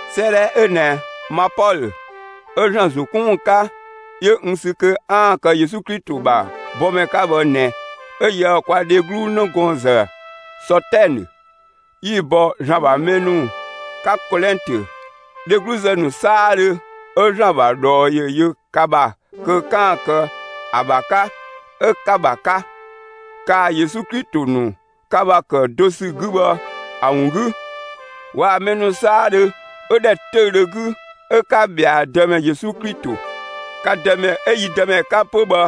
'Sëëdhɛ 'ö ꞊nɛ, ma Pɔlö 'ö ‑Zlan ‑zo 'kun ‑wun 'ka, 'yö n sü kö 'aan‑ kë Yesu Klito ‑bha bɔmɛ 'ka bhë ꞊nɛ 'ö yië‑ kwa dheglu 'nëgɔɔnzë Sɔtɛnë 'yi‑ bɔ ‑Zlan ‑bha mɛ ‑nu 'ka Kolɛntö, dhegluzë ‑nu 'saadhö 'ö ‑Zlan ‑bha ꞊dhɔɔ ‑yö yö ka ‑bha kö 'kaan‑ kë ‑a ‑bha 'ka 'ö 'ka‑ ‑bha 'ka, kaa‑ Yesu Klito ‑nu ka ‑bha ‑kë do ‑sü 'gü bhë ‑a ‑wun 'gü, waa‑ mɛ ‑nu 'saadhö 'ö ‑dhɛ 'töüdhö 'gü 'ö 'ka ꞊bhɛa' Dëmɛ Yesu Klito, ka Dëmɛ 'ö yi Dëmɛ 'ka 'pö bhë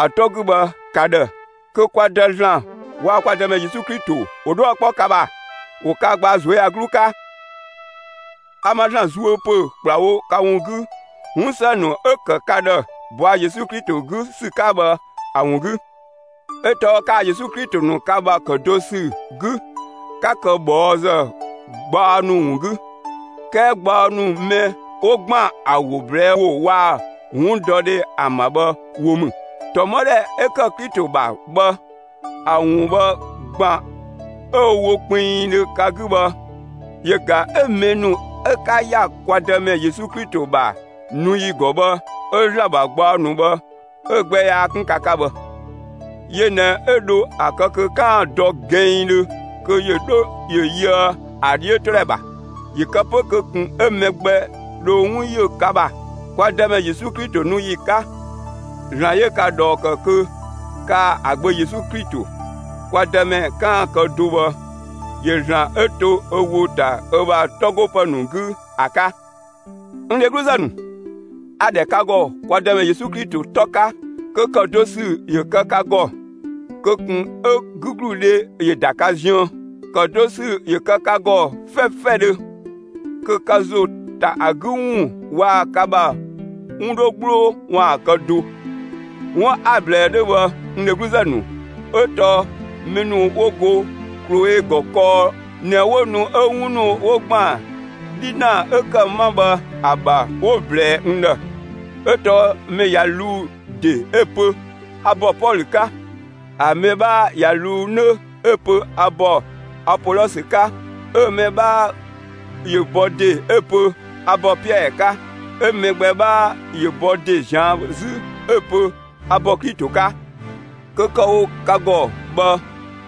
‑a 'tɔ 'gü bhë ka ‑dhë. Kö kwa Dë ‑Zlan, waa‑ kwa Dëmɛ Yesu Klito ‑wo 'dhuë‑ 'kpɔ ka ‑bha, ‑wo ka gbaa ꞊zuöyagluu 'ka. A ma ‑Zlan zuö ‑pö ‑kplawo ka ‑wun 'gü 'wun ‑së ‑nu 'ö‑ ‑kë ka ‑dhë ꞊bɔa' Yesu Klito 'gü ‑sü 'ka bhë ‑a ‑wun 'gü. 'Ö tɔɔ kaa‑ Yesu Klito ‑nu ka ‑bha ‑kë do ‑sü 'gü, 'ka kë ꞊bhɔɔzë gbaɔ ‑nu ‑wun 'gü; 'kɛɛ gbaɔ ‑nu mɛ 'wo ‑gban ‑a ‑wo ꞊blɛɛ' ‑wo waa‑ 'wundɔdhe ‑an ‑bha bhë wo ‑mü. ‑Tɔmɔdhɛ 'ö ‑kë Klito ‑bha bhë, ‑a ‑wun bhë ‑gban 'ö‑ wo kpinngdhö ka 'gü bhë, yö ꞊ga 'ö mɛ ‑nu 'ö 'ka ‑ya kwa Dëmɛ Yesu Klito ‑bha nu ‑yi ‑gɔ bhë 'ö ‑Zlan ‑bha gbaɔ ‑nu bhë 'ö‑ gbɛ yaa 'kun ka 'ka bhë. Yö ꞊nɛ 'ö dho ‑a kë kö 'kaan‑ dɔ gɛnngdhö kö ‑yö 'dho ‑yö yöë ‑a 'dhiötodhɛ ‑bha; ‑yö kë 'pö kö ꞊kun 'ö mɛ gbɛ dho 'wun yö ka ‑bha, kwa Dëmɛ Yesu Klito nu ‑yi 'ka. ‑Zlan 'yö ka ꞊dhɔɔ ‑kë kö kaa‑ ‑a Gbö Yesu Klito, kwa Dëmɛ 'kaan‑ kë do bhë, ‑yö ‑Zlan 'ö to ö ‑wo ‑ta ö ‑bha 'tɔ 'go ‑pë ‑nu 'gü ‑a 'ka. N dhegluzë ‑nu, a‑ ‑dhɛ ka ‑gɔ kwa Dëmɛ Yesu Klito 'tɔ 'ka, kö ‑kë do ‑sü ‑yö kë ka ‑gɔ; kö ꞊kun 'ö 'gügludhe ‑yö ‑da ka ziën. ‑Kë do ‑sü ‑yö kë ka ‑gɔ 'fɛfɛdhö, kö ka ‑zo ‑ta ‑a 'gü ‑wun waa‑ ka ‑bha 'wun 'dho 'gbloo ‑waan kë do. 'Wun 'a‑ ꞊blɛɛ 'dhö bhë, n dhegluzë ‑nu, 'ö tɔɔ mɛ ‑nu 'wo go Kloe ‑gɔ kɔɔ ꞊nɛ 'wo nu 'ö 'wun ‑nu 'wo ‑gban 'dhinaa 'ö ‑kë 'ma bhë ‑a ‑bha 'wo‑ ꞊blɛɛ n ‑dhë. 'Ö tɔɔ mɛ ꞊ya ꞊luu' ‑de 'ö‑ pö: «A ‑bɔ Pɔlö 'ka»; ‑a mɛ 'bhaa ꞊ya ꞊luu' 'nö 'ö‑ pö: «A ‑bɔ Apolɔsö 'ka»; 'ö‑ mɛ 'bhaa ‑yö bɔ ‑de 'ö‑ pö: «A ‑bɔ Piɛɛ 'ka»; 'ö mɛ gbɛ 'bhaa ‑yö bɔ ‑de ꞊zian' 'zü 'ö‑ pö: «A ‑bɔ Klito 'ka.» Kö kë‑ wo ka ‑gɔ bhë,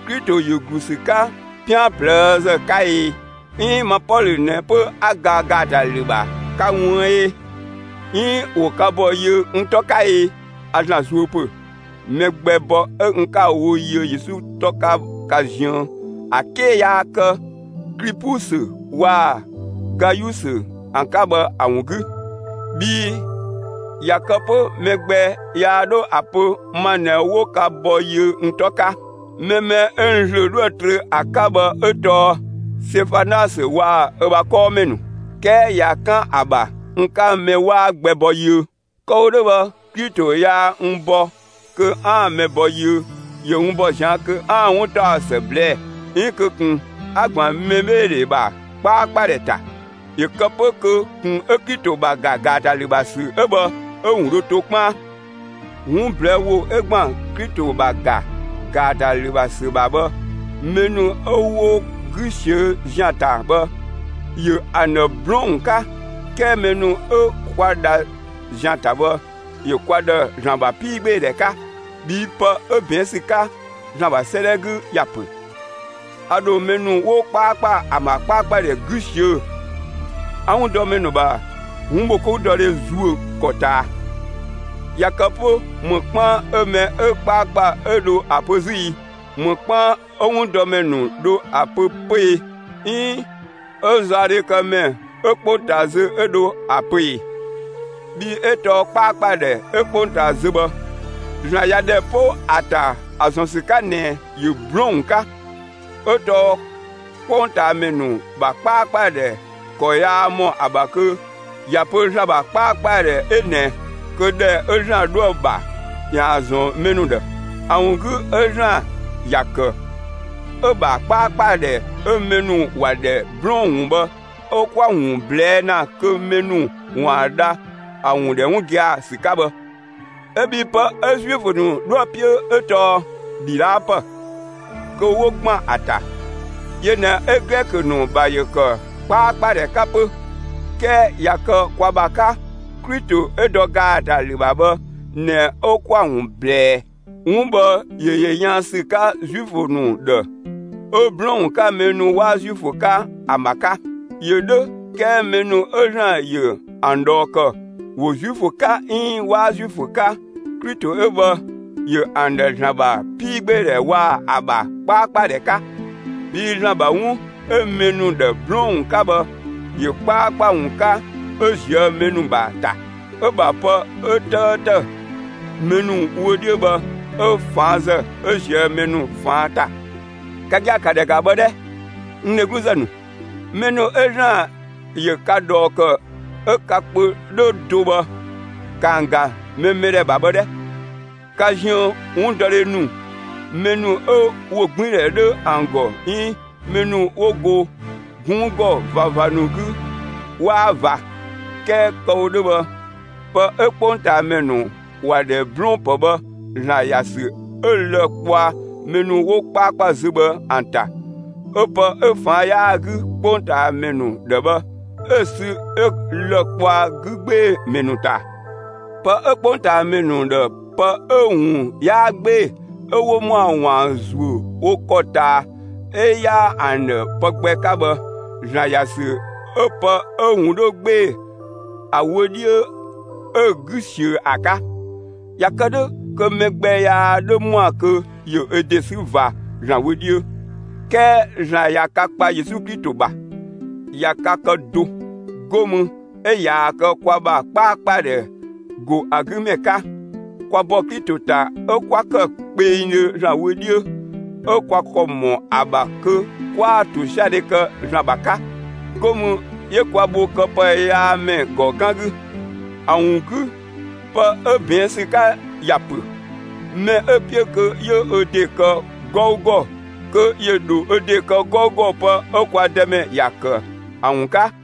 Klito ‑yö ‑glu ‑sü 'ka 'pian ꞊plëëzë 'ka e? 'Iin ma Pɔlö ꞊nɛ 'pö 'a ga ‑gaatalü ‑bha ka ꞊wuën' ꞊e? 'Iin ‑wo ka ‑bɔ yiö n 'tɔ 'ka e? A ‑Zlan zuö ‑pö, mɛ gbɛ bɔ 'ö n 'ka‑ wo yiö Yesu 'tɔ 'ka ka ziën ‑a 'ke yaa kë Klipusö waa‑ Gayusö ‑an 'ka bhë ‑a ‑wun 'gü. Bhii ꞊ya kë 'pö mɛ gbɛ yaa 'dho ‑a pö ma ꞊nɛ 'wo ka bɔ yiö n 'tɔ 'ka. Mɛ mɛ 'ö n ‑zlö 'dhoë‑ trö ‑a 'ka bhë 'ö tɔɔ Sefanasö waa‑ ö ‑bha 'kɔɔmɛ ‑nu. 'Kɛɛ ꞊ya 'kan ‑a ‑bha n 'ka mɛ 'waa gbɛ bɔ yiö. Kë‑ wo 'dhö bhë, Klito yaa n bɔ kö 'aan‑ mɛ bɔ yiö; ‑yö n ‑bɔ ꞊zian' kö 'aan‑ 'wuntaɔsë ꞊blɛɛ'‑; 'iin kö ꞊kun 'a‑ ‑gban mɛbheedhe ‑bha 'kpaakpadhɛ ‑ta, ‑yö kë 'pö kö ꞊kun 'ö Klito ‑bha ‑ga ‑gaatalü ‑bha ‑sü 'ö bhë 'ö‑ ‑wun dho to 'kpaan. 'Wun ꞊blɛɛ' ‑wo 'ö ‑gban Klito ‑bha ‑ga ‑gaatalü ‑bha ‑sü ‑bha bhë, mɛ ‑nu 'ö 'wo 'gü ꞊siö' ‑zian ‑ta bhë, ‑yö ‑an ‑dhë 'blɔɔn‑ ‑wun 'ka. 'Kɛɛ mɛ ‑nu 'ö 'kwa dha ‑zian ‑ta bhë, ‑yö kwa ‑dhë ‑Zlan ‑bha 'piigbeedhɛ 'ka. Bhii pë 'ö ꞊bɛɛn' ‑sü 'ka ‑Zlan ‑bha 'sëëdhɛ 'gü ‑ya ‑pö: A ‑dho mɛ ‑nu 'wo 'kpaakpa ‑an ‑bha 'kpaakpadhɛ 'gü ꞊siö'‑, 'a 'wundɔmɛ ‑nu ‑bha 'wunbhokoudɔdhe ‑zuö ‑kɔ ꞊taa. ꞊Ya kë 'pö ‑më 'kpaan 'ö mɛ 'ö 'kpaakpa 'ö dho ‑a pö 'zü i? ‑Më 'kpaan 'ö 'wundɔmɛ ‑nu dho ‑a pö 'pö e? 'Iin 'ö zaɔdhekëmɛ 'ö 'kpongtaa zö 'ö dho ‑a pö ꞊e? Bhii 'ö tɔɔ 'kpaakpadhɛ 'ö 'kpongtaa zö bhë, ‑Zlan ꞊ya ‑dhɛ 'po ‑a ‑ta ‑a ‑zɔn ‑sü 'ka ꞊nɛ ‑yö 'blɔɔn‑ ‑wun 'ka. 'Ö tɔɔ 'kpongtaamɛ ‑nu ‑bha 'kpaakpadhɛ ‑kɔ yaa ‑mɔ ‑a ‑bha kö ‑ya pö ‑Zlan ‑bha 'kpaakpadhɛ 'ö ꞊nɛ, kö ‑dhɛ 'ö ‑Zlan 'dhoë‑ ‑bha, ‑yaan ‑zɔn mɛ ‑nu ‑dhë. ‑A ‑wun 'gü 'ö ‑Zlan ‑ya ‑kë 'ö‑ ‑bha 'kpaakpadhɛ 'ö mɛ ‑nu ‑wa ‑dhɛ 'blɔɔn‑ ‑wun bhë 'ö 'kwa‑ ‑wun ꞊blɛɛ' ‑na kö mɛ ‑nu ‑waan dha ‑a ‑wun ‑dhɛ 'wun gia‑ ‑sü 'ka bhë. 'Ö bhii pë 'ö Zuifö ‑nu 'dhoë‑ 'piö 'ö tɔɔ ‑dhidhaapë, kö 'wo ‑gban ‑a ‑ta; yö ꞊nɛ 'ö Glɛkö ‑nu ‑bha ‑yö ‑kë 'kpaakpadhɛ 'ka 'pö. 'Kɛɛ ꞊ya kë kwa ‑bha 'ka, Klito 'ö dɔ ‑gaatalü ‑bha bhë ꞊nɛ 'ö 'kwa‑ ‑wun ꞊blɛɛ'‑. 'Wun bhë ‑yö ‑yö yaan ‑sü 'ka Zuifö ‑nu ‑dhë 'ö 'blɔɔn‑ ‑wun 'ka mɛ ‑nu 'waa Zuifö 'ka ‑an ‑bha 'ka. ‑Yö 'dhö, 'kɛɛ mɛ ‑nu 'ö ‑Zlan ‑yö ‑an ꞊dhɔɔ ‑kë, ‑wo Zuifö 'ka 'iin 'waa Zuifö 'ka, Klito 'ö bhë, ‑yö ‑an ‑dhë ‑Zlan ‑bha 'piigbeedhɛ waa‑ ‑a ‑bha 'kpaakpadhɛ 'ka. Bhii ‑Zlan ‑bha 'wun 'ö mɛ ‑nu ‑dhë 'blɔɔn‑ ‑wun 'ka bhë, ‑yö 'kpaakpa ‑wun 'ka 'ö ꞊zië' mɛ ‑nu ‑bha ‑ta; 'ö‑ ‑bha pë 'ö 'tëëtë mɛ ‑nu wö 'dhiö bhë, 'ö ꞊faanzë 'ö ꞊zië' mɛ ‑nu ꞊faan' ‑ta. Ka gia‑, ‑ka ‑dhɛ ‑ga bhë 'dhɛ, n dhegluzë ‑nu; mɛ ‑nu 'ö ‑Zlan ‑yö ka ꞊dhɔɔ ‑kë 'ö ka kpö 'dhö do bhë, ‑ka ‑an ‑ga mɛ mɛdhɛ ‑bha bhë 'dhɛ! Ka ziën 'wundɔmɛ ‑nu, mɛ ‑nu 'ö ‑wogbiindhɛ 'dhö ‑an ‑gɔ 'iin mɛ ‑nu 'wo go 'gunng ‑gɔ ꞊vava ‑nu 'gü 'waa ꞊va. 'Kɛɛ kë‑ wo 'dhö bhë, pë 'ö 'kpongtaamɛ ‑nu ‑wa ‑dhɛ 'blɔɔn‑ ‑pë bhë ‑Zlan ‑ya ‑sü 'ö lë‑ kpɔa mɛ ‑nu 'wo 'kpaakpa zö bhë ‑an ‑ta, 'ö pë 'ö ꞊faan' 'yaa‑ 'gü 'kpongtaamɛ ‑nu ‑dhë bhë, 'ö‑ sü 'yö lë‑ kpɔa 'gü 'gbee‑ ‑mɛ ‑nu ‑ta. Pë 'ö 'kpongtaamɛ ‑nu ‑dhë pë 'ö‑ ‑wun 'yaa 'gbee‑, 'ö 'wo ‑mɔa ‑waan ‑zuö wo ‑kɔ ꞊taa 'ö 'yaa ‑an ‑dhë pë gbɛ 'ka bhë, ‑Zlan ‑ya ‑sü 'ö pë 'ö‑ ‑wun 'dhö 'gbee‑ ‑a wö 'dhiö 'ö‑ 'gü ꞊siö ‑a 'ka. ꞊Ya kë 'dhö kö mɛ gbɛ yaa 'dhö ‑mɔa kö ‑yö ö ‑de 'sü ꞊va ‑Zlan wö 'dhiö. 'Kɛɛ ‑Zlan ꞊ya ka kpa Yesu Klito ‑bha, ꞊ya ka kë do; 'go mü 'ö ꞊yaa‑ kë kwa ‑bha 'kpaakpadhɛ ‑go ‑a 'gü ‑mɛ 'ka; kwa ‑bɔ Klito ‑ta 'ö kwa ‑kë kpengdhö ‑Zlan wö 'dhiö, 'ö kwa ‑kɔ ‑mɔ ‑a ‑bha kö 'kwa ‑tosiadhe kë ‑Zlan ‑bha 'ka; 'go mü 'yö kwa bho këpëyaamɛ ‑gɔ 'gan 'gü. ‑A ‑wun 'gü pë 'ö ꞊bɛɛn' ‑sü 'ka ꞊ya pö: Mɛ 'ö‑ 'piö kö 'yö ö ‑de kë 'gɔugɔ, kö ‑yö ‑dho ö ‑de kë 'gɔugɔ pë 'ö kwa Dëmɛ ‑ya ‑kë ‑a ‑wun 'ka.